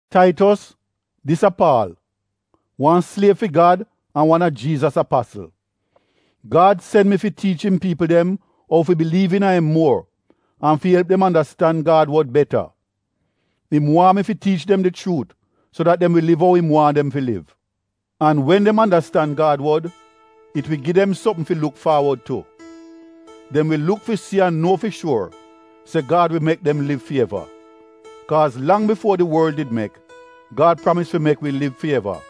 Taitos, dis a Paal, wan sliev fi Gad an wan a Jiizas apasl. Gad sen mi fi tiich im piipl dem ou fi biliiv iina im muor an fi elp dem andastan Gad wod beta. Im waahn mi fi tiich dem di chuut so dat dem wi liv ou im waahn dem fi liv. An wen dem andastan Gad wod it wi gi dem sopm fi luk faawod tu. Dem wi luk fi si an nuo fi shuor se Gad wi mek dem liv fi eva. Kaaz lang bifuo di worl did mek Gad pramis fi mek wi liv fi eva,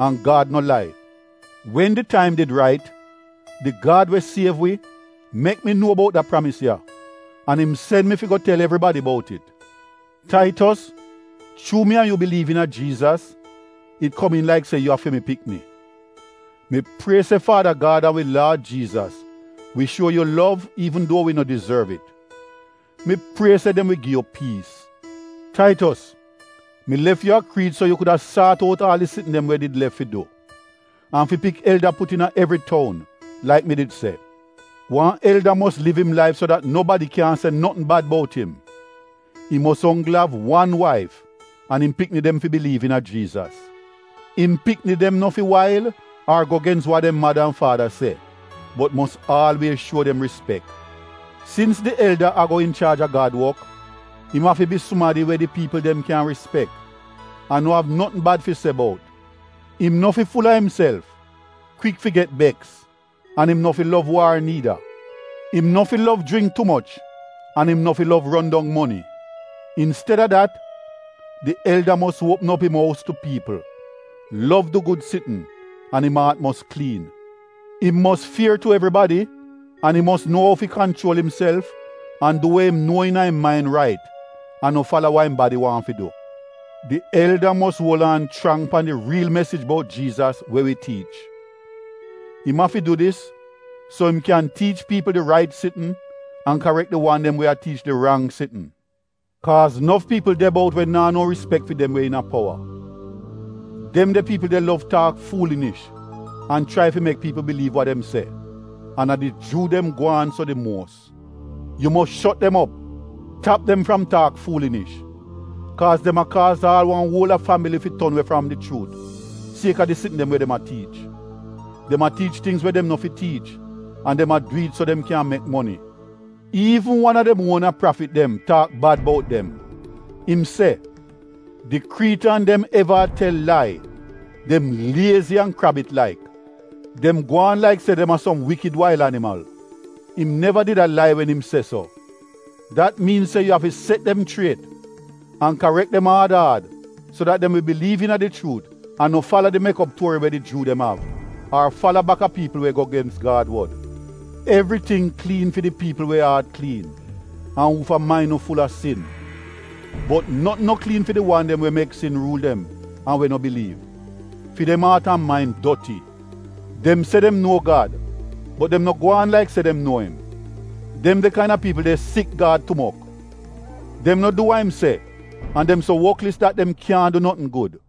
an Gad no lai. Wen di taim did rait, di Gad we siev wi, mek mi nuo bout da pramis ya an im sen mi fi go tel evribadi bout it. Taitos chuu mi an yu biliiv iina Jiizas, it komiin laik se yu a fi mi pikni. Mi prie se Faada Gad an wi Laad Jiizas wi bles an kip yu. Mi prie se dem wi gi yu piis. Taitos, mi lef yu a Kriit so yu kuda saat out aal di sitn dem we did lef fi du, an fi pik elda put iina evri toun, laik mi did se. Wan elda mos liv im laif so dat nobadi kyan se notn bad bout im. Im mos onggl av wan waif an im pikni dem fi biliiv iina Jiizas. Im pikni dem no fi wail ar go gens wa dem mada an faada se bot mos aalwiez shuo dem rispek. Sins di elda ago inchaaj a Gad wok, im afi bi sumadi we di piipl dem kyan rispek an no av notn bad fi se bout. Im no fi ful-a imself, kwik fi get beks an im no fi lov waar niida. Im no fi lov jringk tu moch an im no fi lov ron dong moni. Insteda dat, di elda mos uopm op im ous tu piipl, lov du gud sitn an im aat mos kliin. Im mos fier tu evribadi an im mos nuo ou fi kanchuol imself an du we im nuo iina im main rait an no fala wa im badi waahn fi du. Di elda mos uol aan chrang pan di riil mesij bout Jiizas, we wi tiich. Im afi du dis so im kyan tiich piipl di rait sitn an karek di wan dem we a tiich di rang sitn. Kaaz nof piipl de bout we naa no rispek fi dem we iina powa. Dem de piipl de lov taak fuulinish an chrai fi mek piipl biliiv wa dem se, an a di Juu dem gwaan so di muos. Yu mos shot dem op; tap dem fram taak fuulinish. Kaaz dem a kaaz aal wan uol a fambili fi ton we fram di chuut sieka di sitn dem we dem a tiich. Dem a tiich tingz we dem no fi tiich an dem a du it so dem kyan mek moni. Iivn wan a dem uona prafit dem taak bad bout dem. Im se, “Di Kriitan dem eva a tel lai. Dem liezi an krabit laik. Dem gwaan laik se dem a som wikid wail animal.” Im neva did a lai wen im se so. Dat miin se yu afi set dem chriet an karek dem aad aad, so dat dem wi biliiv iina di chuut an no fala di mek op tuori we di Juu dem av, ar fala bak a piipl we go gens Gad wod. Evriting kliin fi di piipl we aat kliin an uufa main no ful-a sin. Bot notn no kliin fi di wan dem we mek sin ruul dem an we no biliiv. Fi dem aat an main doti. Dem se dem nuo Gad, bot dem no gwaan laik se dem nuo im. Dem de kaina piipl de sik Gad tumok. Dem no du wa im se an dem so wotlis dat dem kyaahn du notn gud.